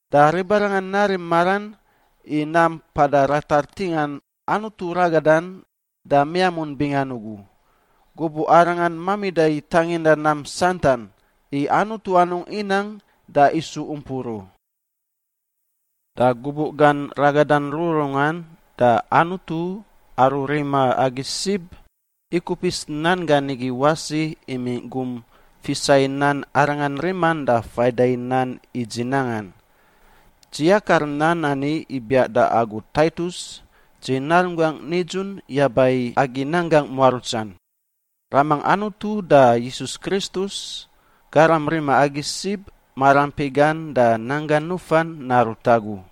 Da ribarangan narim maran i nam mpada ratar ntingan Anutu ragadan da miamun bingan ugu, gubuꞌ Arangan mamida i tanginda nam santan, i Anutu anungꞌ inang da isu umpur u. Da gubuꞌ gan ragadan rururungan, da Anutu, aru rima agi sib, ikupis nan gan igi wasi imingꞌ gum fisa i nan Arangan riman da faida nan i dzi nangan. Dzi yakar nan ani ibiaꞌ da agu Taitus, dzi narunggangꞌ nidzun yaba i agi nanggangꞌ muarutsan. Ramangꞌ Anutu da Yisus Kristus, Garam rima agi sib, maraampi gan da nan gan nufan narut agu.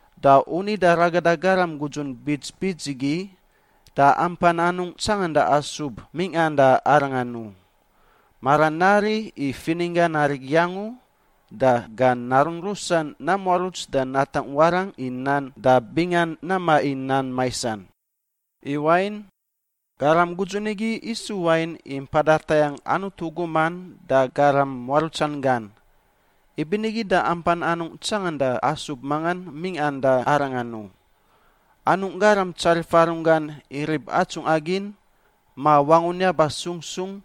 Da u nida ragada garam gudzun bits bits igi, da ampan anungꞌ tsanganda asub mingꞌan da arangan u: maran nari i fininggan arigi angu, da gan narun rusan namuaruts da natangꞌ warangꞌ i nan da bingan namaꞌ i nam maisan. I wain, garam gudzun igi isu wain i mpada tayangꞌ Anutu guman da garam muarutsan gan, ibinigi da ampan anungꞌ tsanganda asub mangan mingꞌa da arangan u: anungꞌ garam tsarifa runggan i rib atsungꞌa gin, ma wangun yaba sung sung,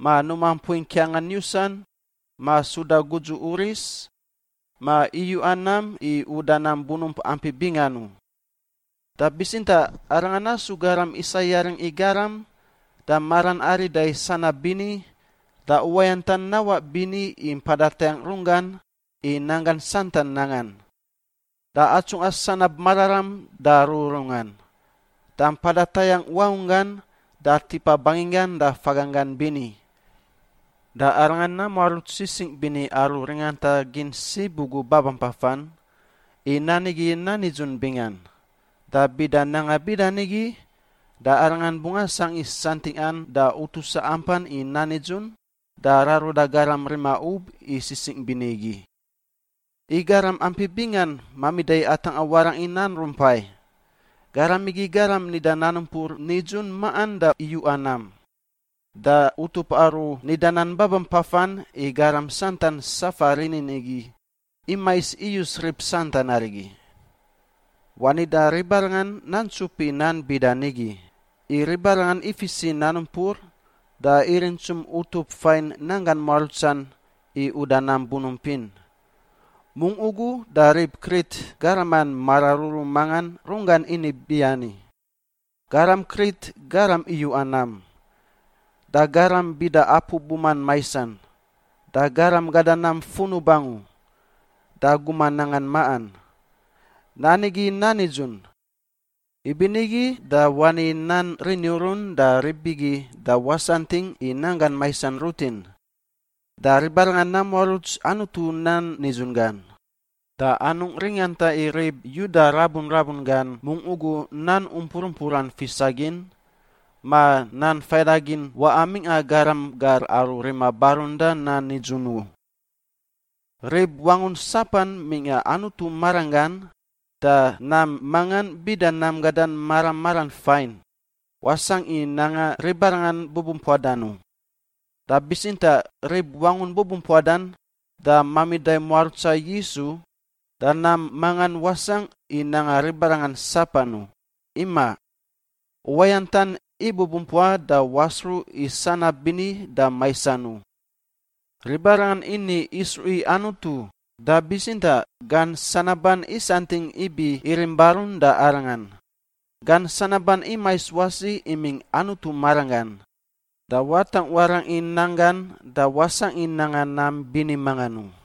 ma numa mpui ngkiangan yusan, ma suda gudzu uris, ma iyuꞌa nam i uda nam bunump ampi bingan u. Da bitsintaꞌ arangan nasu garam isa yaring i garam, da maran arida i sanab bini, da uwayantan nawaꞌ bini i mpada tayangꞌ runggan i nanggan santan nangan, da atsungꞌa sanab mararam da rururungan, da mpada tayangꞌ wangunggan da tipa banginggan da faganggan bini. Da arangan namuaruts sisingꞌ bini aru ringanta gin sib ugu babampafan, i nan igi nan nidzun bingan. Da bida nanga bida nigi, da arangan bungꞌ asangꞌ i santingꞌan da utusa ampan i nan nidzun, da raruda garam rima ub i sisingꞌ bini igi. I garam ampi bingan mamida i atangꞌa warangꞌ i nan rumpai. Garam igi garam nida nan umpur nidzun maꞌan da iyuꞌa nam. Da utup aru nida nan babampafan i garam santan safa rinin igi imais iyus rib santan arigi. Wani da ribarangan nantsup i nan bida nigi, i ribarangan ifis i nan umpur da irintsum utup fain nanggan muarutsan i uda nam bunump in. Mungꞌ ugu da rib Krit garaman mararuru mangan runggan ini biani, “Garam Krit garam iyuꞌa nam, da garam bida apu buman maisan, da garam gada nam funub angu da guman nangan maꞌan.” Nan igi nan nidzun. Ibinigi da wani nan rini urun da rib igi da wasantingꞌ i nanggan maisan rutin, da ribarangan namuaruts Anutu nan nidzun gan da anungꞌ ringanta i rib Yuda rabu rabun gan mungꞌ ugu nan umpur umpuran fisa gin, ma nan faidagin waꞌa mingꞌa garam gar aru rima barun da nan nidzun u. Rib wangun sapan mingꞌa Anutu maranggan, da nam mangan — bida nam gadan mara maran fain — wasangꞌ i nanga ribarangan bubumpuadan u. Da bitsintaꞌ rib wangun bubumpuadan da mamida i muarutsa Yisu, da nam mangan wasangꞌ i nanga ribarangan sapan u. Imaꞌ, uwayantan ibubumpua da wasruꞌ i sanab bini da maisan u. Ribarangan ini isruꞌ i Anutu, da bitsintaꞌ gan sanaban isantingꞌ ibi irim barun da Arangan. Gan sanaban imais wasi imingꞌ Anutu maranggan, da watangꞌ warangꞌ i nan gan, da wasangꞌ i nanga nam bini mangan u.